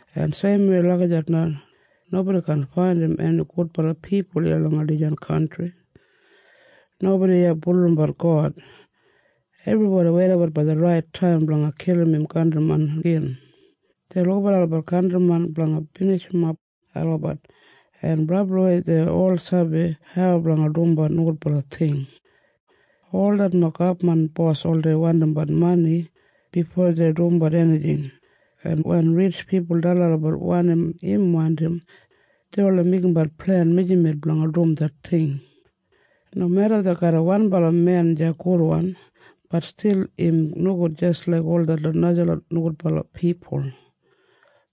En seimwei lagijat na nobodi kaan faindim eni gudbala pipul iya langa dijan kantri. Nobodi iya bulurrumbat God. Ebribodi weidabat blanga det rait taim blanga kilim im kantrimen gin. Dei lukabat olabat kantrimen blanga binijimof olabat, en brabliwei dei ol sabi hau blanga dumbat nogudbala ting. Ol detlot gabman bos oldei wandimbat mani bifo dei dumbat enijing, en wen ritj pipul dalim olabat wanim im wandim, dei oldei meigimbat plen mijamet blanga dum det ting. Nomeda dei garram wanbala men deya gudwan, bat stil im nogud jis laik ol detlot najalot nogudbala pipul.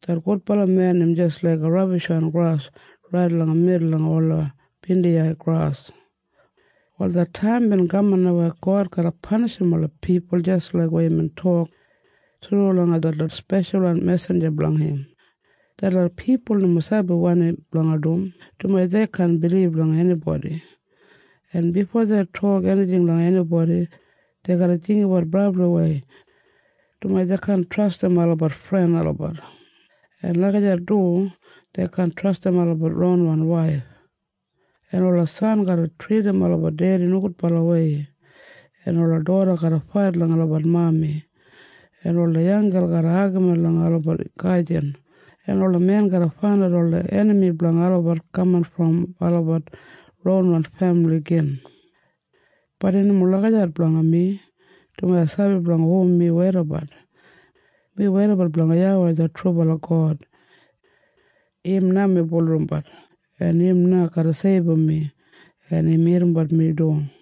Det gudbala men im jis laiga rabishwan gras rait langa midul langa ola bindiyai gras. “Wal det taim bin kaman na weya God garra panishim ola pipul jis laik weya imbin tok thru langa detlot speshalwan mesinja blanga im. Detlot pipul nomo sabi wanim blanga du, dumaji dei kaan bilib langa enibodi. En bifo dei tok enijing langa enibodi, dei garra jinggabat brabliwei, dumaji dei kaan trastim olabat fren olabat. En lagijat du dei kaan trastim olabat ronwan waif. En ola san garra tridim olabat dedi nogudbalawei, en ola doda garra fait langa olabat mami, en ola yanggel garra agamin langa olabat gajin, en ola men garra faindat ola enami blanga olabat kaman brom olabat ronwan femili gin. “Bat im nomo lagijat blanga mi, dumaji ai sabi blanga hu mi weidabat. Mi weidabat blanga YAWEI det trubala God. Im na mi bulurrumbat. En im na garra seibum mi. En im irrimbat mi du.”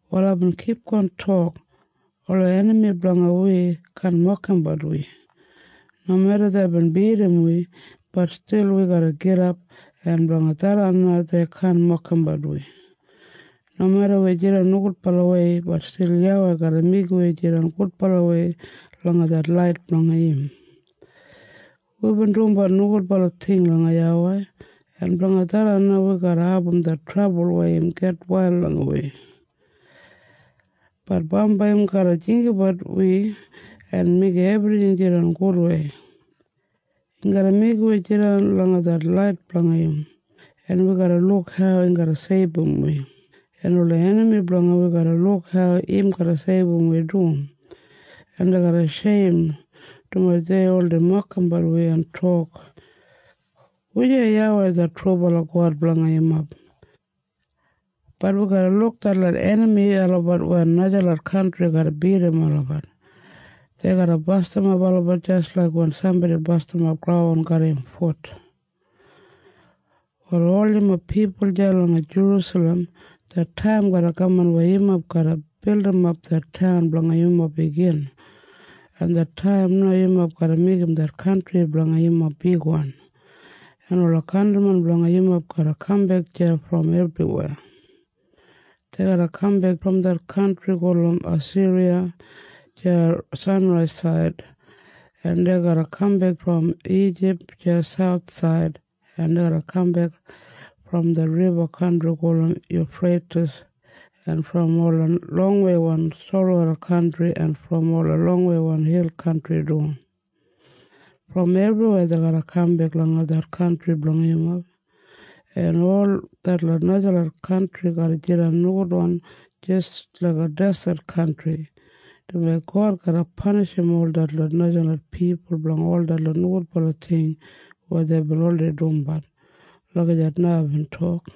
Wal aibin kipgon tok, “Ola enami blanga wi kaan mokimbat wi. Nomeda deibin bidim wi, bat stil wi garra gidap, en blanga tharran na dei kaan mokimbat wi. Nomeda wi jidan nogudbalawei, bat stil YAWEI garra meigim wi jidan gudbalawei langa det lait blanga im. Wibin dumbat nogudbala ting langa YAWEI, en blanga tharran na wi garra abum det trabul weya im gitwail langa wi. Bat bambai im garra jinggabat wi en meigim ebrijing jidan gudwei. Im garra meigim wi jidan langa det lait blanga im, en wi garra luk hau im garra seibum wi, en ola enami blanga wi garra luk hau im garra seibum wi du, en dei garra sheim, dumaji deibin oldei mokimbat wi en tok, ‘Wujei YAWEI det trubala God blanga yumob?’ Bat wi garra luk detlot enami olabat wen najalot kantri garra bidim olabat. Dei garra bastimap olabat jis laik wen sambodi bastimap graun garram im fut. “Wal ol yumob pipul deya langa Jerusalem, det taim garra kaman weya yumob garra bildimap det taun blanga yumob igin, en det taim na yumob garra meigim det kantri blanga yumob bigwan, en ola kantrimen blanga yumob garra kambek deya brom ebriweya. Dei garra kambek brom det kantri gulum Asiriya deya sanraisaid, en dei garra kambek brom Ijip deya sauthsaid, en dei garra kambek brom det riba kantri gulum Yufreitis en brom ola longweiwan solwoda kantri en brom ola longweiwan hil kantri du. Brom ebriweya dei garra kambek langa det kantri blanga yumob, en ol detlot najalot kantri garra jidan nogudwan jis laiga deset kantri, dumaji God garra panishim ol detlot najalot pipul blanga ol detlot nogudbala ting weya deibin oldei dumbat.” Lagijat na aibin tok.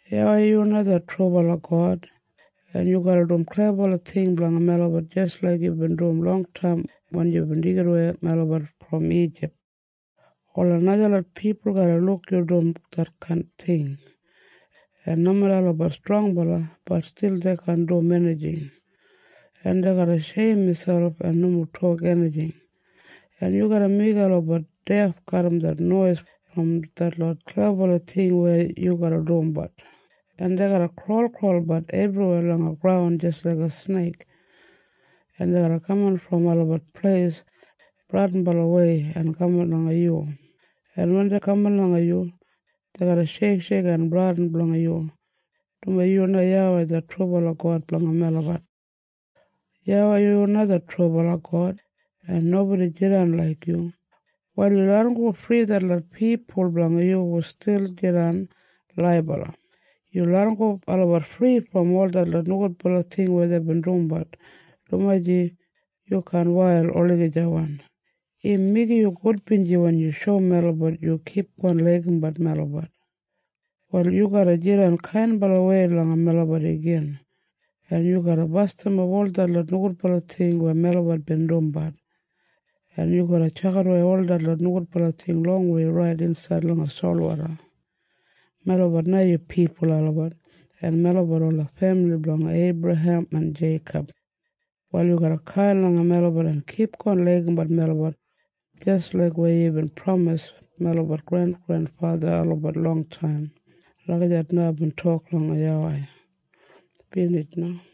“YAWEI, yu na det trubala God, en yu garra dum klebabala ting blanga melabat jis laik yubin dum longtaim wen yubin deigidawei melabat brom Ijip. Ola najalot pipul garra luk yu dum detkain ting, en nomeda olabat strongbala, bat stil dei kaan dum enijing, en dei garra sheim miselp en nomo tok enijing, en yu garra meigim olabat def garram det nois brom detlot klebabala ting weya yu garra dumbat, en dei garra kraulkraulbat ebriweya langa graun jis laiga sneik, en dei garra kaman brom olabat pleis bradinbalawei en kaman langa yu. En wen dei kaman langa yu, dei garra sheiksheik en bradin blanga yu, dumaji yu na YAWEI det trubala God blanga melabat. “YAWEI, yu na det trubala God, en nobodi jidan laik yu. Wal yu larramgo fri ol detlot pipul blanga yu hu stil jidan laibala. Yu larramgo olabat fri brom ol detlot nogudbala ting weya deibin dumbat, dumaji yu kaan wail olagijawan. Im meigim yu gudbinji wen yu shoum melabat yu kipgon laigimbat melabat. Wal yu garra jidan kainbalawei langa melabat igin, en yu garra bastimap ol detlot nogudbala ting weya melabat bin dumbat, en yu garra tjakidawei ol detlot nogudbala ting longwei rait insaid langa solwoda. Melabat na yu pipul olabat, en melabat ola femili blanga Eibrahem en Jeikob. Wal yu garra kain langa melabat en kipgon laigimbat melabat jis laik weya yubin pramisim melabat grengrenfatha olabat longtaim.” Lagijat na aibin tok langa YAWEI. Binij na.